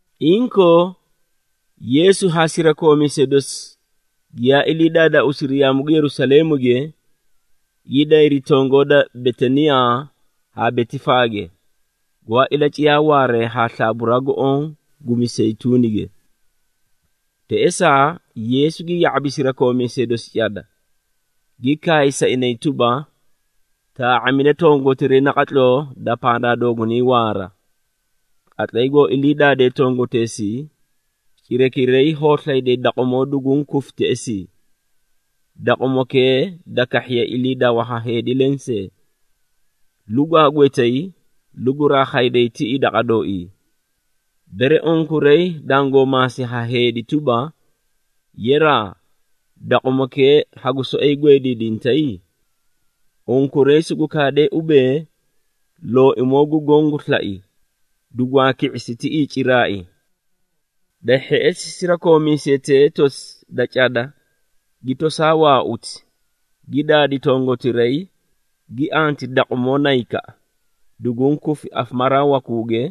Inkoo Yeesu haa sirakoomiisee dosi giyaa ilii daadaauusiri yaamu gu Yerusaleemuge, gi dayri tongoo da Betaniyaa haa Betifaage, gwaa ilaciyaa waaree haa slaaburaa gu oõ gu Miseyituunige. Teꞌesaa, Yeesu gi ya⁄abi sirakoomiisee dosi cada, gi kaay sa inay tuba, “Taa⁄amida tongotiray naqatloo da pandaa doogunay waara. Qatlay goo ilii daadee tongoteesii, cirakiray hoo slayday daqumoo duguũ kufi teꞌesii, daqumokee da kahhiye iliidawa ha heedi lensee. Lugwaa gwetay, luguraa khayday tiꞌii daqa dooii. Bere unkuray dangoo maasi ha heedi tuba, ‘Yeraa, daqumokee hagu soꞌoyi gweediidintay?’ Unkuray sugu kaadee ubee, ‘Looimoo gu Goõ gu slai, dugwaa ki⁄isi tiꞌii ciraai.’” Da hheꞌesi sirakoomiisetee tosi da cada gi toosaa waauti, gi daadi tongotiray, gi anti daqumoo naykaꞌa, duguũ kufi afamaraa wakuuge,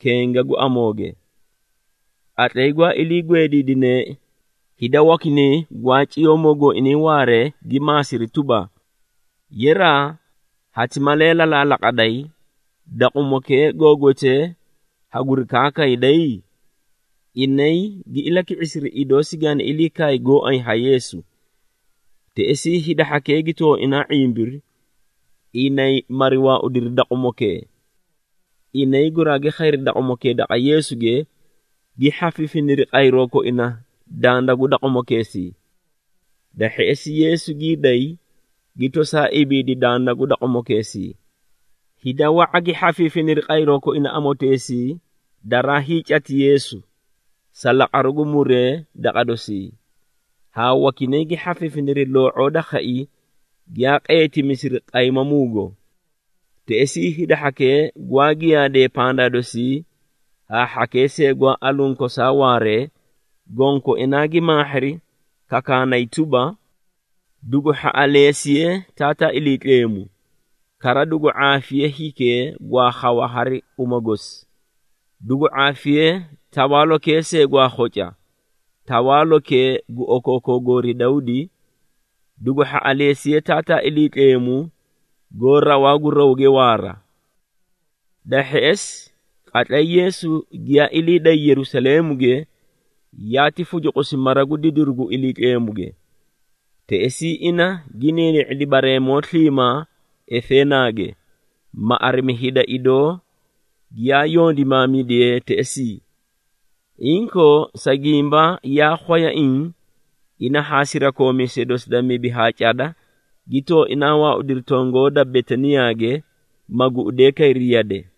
kenga gu amooge. Qatlay gwaa ilii gweediidineei, hida wakinay gwaa ciyoomoo gooinay waaree gi maasiri tuba, “Yeraa, hati malee lalaalaqaday, daqumokee goo gwetee haguri kaakayday?” Inay gi ilaki⁄isiri, idoo sigaani ilii kaay gooay ha Yeesu. Teꞌesii hida hhakee gi tooinaa ⁄imbiri, inay mari waaudiri daqumokee. Inay guraagi khayri daqumokee daqa Yeesuge, gi hhafiifiniri qayroo koina danda gu daqumokeesii. Da hheꞌesi Yeesu gii day, gi tosaa ibiidi danda gu daqumokeesii. Hida wa⁄a gi hhafiifiniri qayroo koina amoteesii daraa hiicati Yeesu sa laqaruu gu muree daqa dosii, haa wakinay gi hhafiifiniri loo⁄oo da khai giyaa qeetimisiri qaymamuugo. Teꞌesii hida hhakee gwaa giyaadee pandaa dosii, haa hhakee see gwaa aluũ kosaa waaree, gonkoinaa gi maahhiri kakaanay tuba, “Dugu hhaꞌaleesiye Taataa Iliitleemu! Kara dugu ⁄aafiye hikee gwaa khawa hari uma gosi! Dugu ⁄aafiye tawaalokee see gwaa khoca, tawaalokee gu okookoo goori Dawdi! Dugu hhaꞌaleesiye Taataa Iliitleemu goó rawaa gu rawge waara!” Da hheꞌesi, qatlay Yeesu giyaa ilii day Yerusaleemuge, yaati fucuqusi mara gu didiru gu Iliitleemuge. Teꞌesii ina gi niini⁄idi bareemoo sliimaa efeenaage, ma arimi hida idoo giyaa yondimaamidiyee teꞌesii. Inkoo sa gimba yaa khwayaiĩ, ina haa sirakoomiisee dosi da mibi haa cada gi tooinaa waaudiri tongoo da Betaniyaage, ma guꞌudee kayri yade.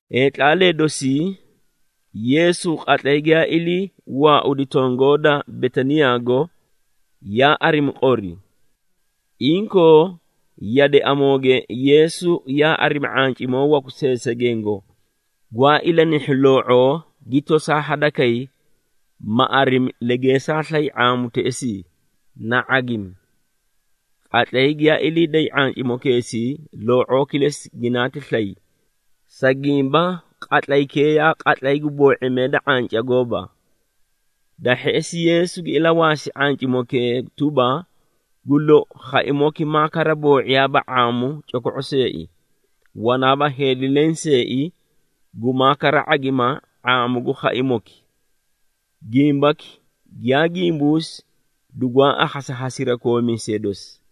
Heetlaalee dosii, Yeesu qatlay giyaa ilii waaudi tongoo da Betaniyaago, yaa arimi qori. Inkoo yade amooge Yeesu yaa arimi ⁄ancimoo waku seesegengo, gwaa ilanihhu loo⁄oo, gi tosaa hadakay, ma arimi legeesaa slay ⁄aamu teꞌesii, na ⁄agimi. Qatlay giyaa ilii day ⁄ancimokeesii loo⁄oo kilesi ginaati slay, sa gimba qatlaykee yaa qatlay gu boo⁄imee da ⁄anca gooba. Da hheꞌesi Yeesu gi ilawaasi ⁄ancimokee tuba, “Gu lou, khaimoki maa kara boo⁄iyaaba ⁄aamu coko⁄o seei, wanaaba heedi lenseei gumaa kara ⁄agima ⁄aamu gu khaimoki!” Gimbaki giyaa gimbuusi dugwaa akhasi ha sirakoomiisee dosi.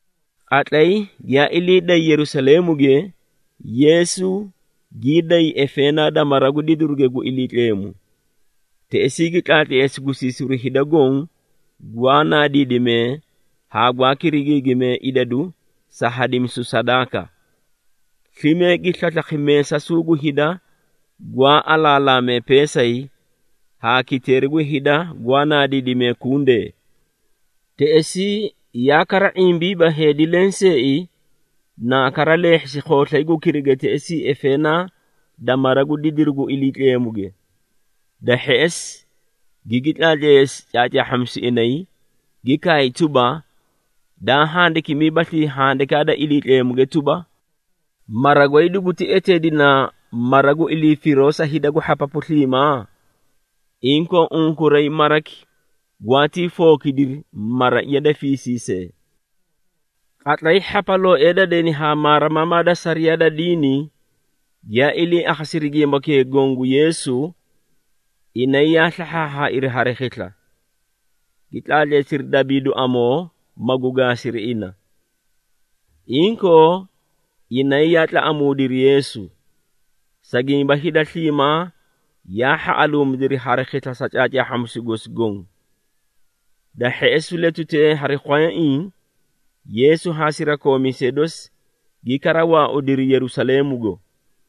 Qatlay giyaa ilii dayri Yerusaleemuge, Yeesu gii day efeenaa da mara gu didiruge gu Iliitleemu. Teꞌesii, gi tlaatleesi gusiisiru hida goõ gwaa naadiidimee haa gwaa kirigiigimee idadu sa hadimisu sadaaka. Slime gi slaslakhi meesasuu gu hida gwaa alaalaamee peesay, haa kiteeri gu hida gwaa naadiidimee kundee. Teꞌesii yaa kara ⁄imbiiba heedi lenseei naa kara leehhisi khooslay gu kiriga teꞌesii efeenaa da mara gu didiru gu Iliitleemuge. Da hheꞌesi gigi tlaatleesi caacaahhamisu inay, gi kaay tuba, “Daa handikimiibaslii Handikaa da Iliitleemuge tuba, ‘Mara goy duguti eteedina mara gu ilii firoo sa hida gu hhapapu sliimaa’? Inkoo unkuray maraki gwaatii fookidiri ‘maraiya da fiisiisee.’” Qatlay hhapalooee da deni haa maarimamaa da sariyaa da diini giyaa ilii akhasiri gimbakee goõ gu Yeesu, inay yaa slahhaahhaairi hari khisla, gi tlaatleesiri dabiidu amoo, magu gaasiri ina. Inkoo inay yaa tlaꞌamuudiri Yeesu, sa gimba hida sliimaa yaa hhaꞌaluumidiri hari khisla sa caacaahhamisu gosi goõ. Da hheꞌesi letutee hari khwayaiĩ Yeesu haa sirakoomiisee dosi gi kara waaudiri Yerusaleemugo.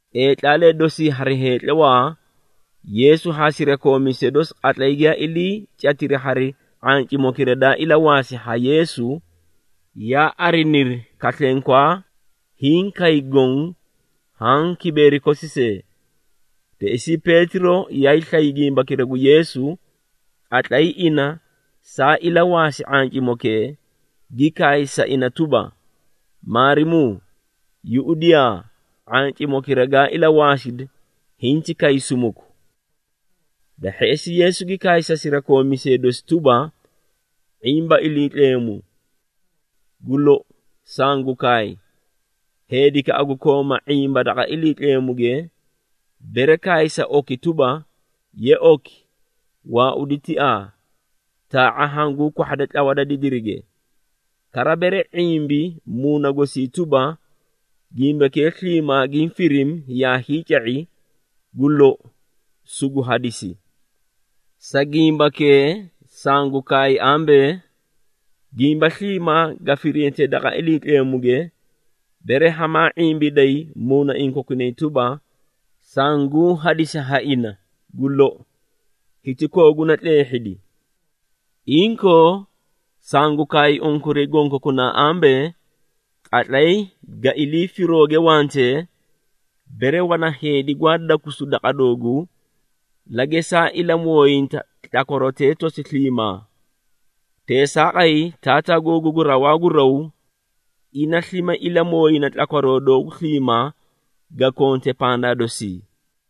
Heetlaalee dosii hari heetlawaa, Yeesu haa sirakoomiisee dosi qatlay giyaa iliicatiri hari ⁄ancimokira daa ilawaasi ha Yeesu, yaa ariniri, kaslenkwaa, hiĩ kay goõ haã kibeeri kosi see. Teꞌesii Peetiro yaay slay gimbakira gu Yeesu, qatlay ina saa ilawaasi ⁄ancimokee, gi kaay sa ina tuba, “Maarimuu, yuꞌudiyaa, ⁄ancimokira gaa ilawaasidi hinti kay sumuku!” Da hheꞌesi Yeesu gi kaay sa sirakoomiisee dosi tuba, “⁄imba Iliitleemu! Gu lou, sangu kaay, heedikaꞌa gu kooma ⁄imba daqa Iliitleemuge, bere kaay sa oki tuba, ‘Ye oki, waaudi tiaa, taa⁄a hanguu kwahhade tlawa da didirige,’ kara bere ⁄imbi muuna gosii tuba, gimbakee sliimaa giĩ firimi yaa hiica⁄i, gu lou, sugu hadisi. Sa gimbakee sangu kaay ambee, gimba sliimaa ga firintee daqa Iliitleemuge, bere hamaa ⁄imbiday muunaiĩ kokunay tuba, sanguũ hadisi ha ina, gu lou, hiti kooguna tleehhidi. Inkoo sangu kaay unkuray gonkokunaa ambee, qatlay ga ilii firooge wantee, bere wana heedi gwaa dakusu daqa dooguu, la gesaa ilamooyinta tlakwarotee tosi sliimaa. Teesaaqay Taataa googu gu rawaa gu raw, ina slime ilamooyina tlakwaroo doogu sliimaa ga konte pandaa dosii.”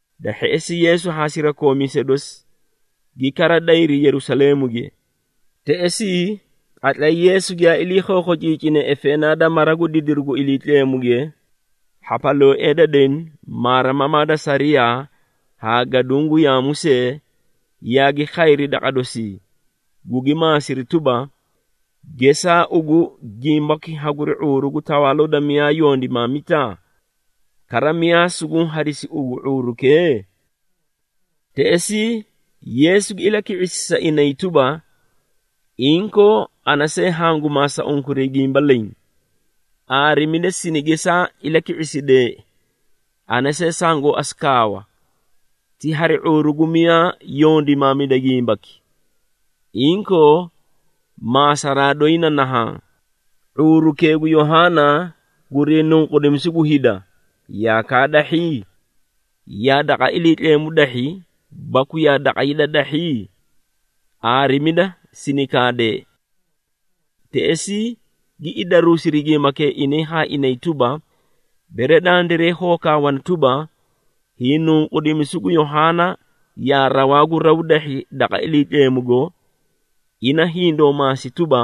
Da hheꞌesi Yeesu haa sirakoomiisee dosi gi kara dayri Yerusaleemuge. Teꞌesii, qatlay Yeesu giyaa ilii khookhociicine efeenaa da mara gu didiru gu Iliitleemuge, hhapalooee da deni, maarimamaa da sariyaa haa gaduũ gu yaamu see yaagi khayri daqa dosii, gugi maasiri tuba, “Gesaa ugu gimbaki haguri ⁄uuru gu tawaaloo da miyaa yondimaamita? Kara miyaa suguũ hadisi ugu ⁄uurukee?” Teꞌesii Yeesu gi ilaki⁄isi sa inay tuba, “Inkoo ana see hangu maasa unkuray gimba leẽ. Aarimida sini gesaa ilaki⁄isideei, ana see sangoo asu kaawa, ti hari ⁄uuru gu miyaa yondimaamida gimbaki. Inkoo, maasaraa doyi na nahaã, ⁄uurukee gu Yohaana gurii nunqudimisu gu hida, yaa kaadahhi? Yaa daqa Iliitleemu dahhi, baku yaa daqa hida dahhi? Aarimida sini kaadee!” Teꞌesii gi idaruusiri gimbakee inay haa inay tuba, “Bere dandiray hoo kaawana tuba, hiinunqudimisu gu Yohaana yaa rawaa gu raw dahhi daqa Iliitleemugo, ina hindoo maasi tuba,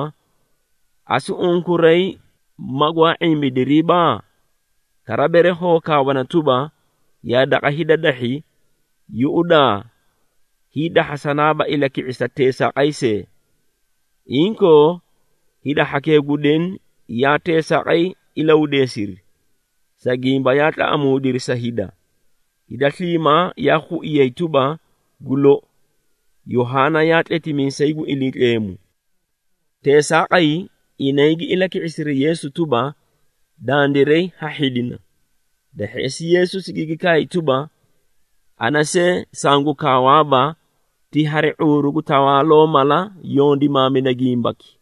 ‘Asu unkuray magwaa ⁄imbidiriiba?’ Kara bere hoo kaawana tuba, ‘Yaa daqa hida dahhi,’ yuꞌudaa, hiidahhasanaaba ilaki⁄isa teesaaqay see!” Inkoo, hida hhakee gu deni yaa teesaaqay ilahudeesiri, sa gimba yaa tlaꞌamuudiri sa hida. Hida sliimaa yaa khuiyay tuba, gu lou, Yohaana yaa tletimiisay gu Iliitleemu. Teesaaqay, inay gi ilaki⁄isiri Yeesu tuba, “Dandiray ha hhidina.” Da hheꞌesi, Yeesu sigigi kaay tuba, “Ana see sangu kaawaaba, ti hari ⁄uuru gu tawaaloo mala yondimaamida gimbaki.”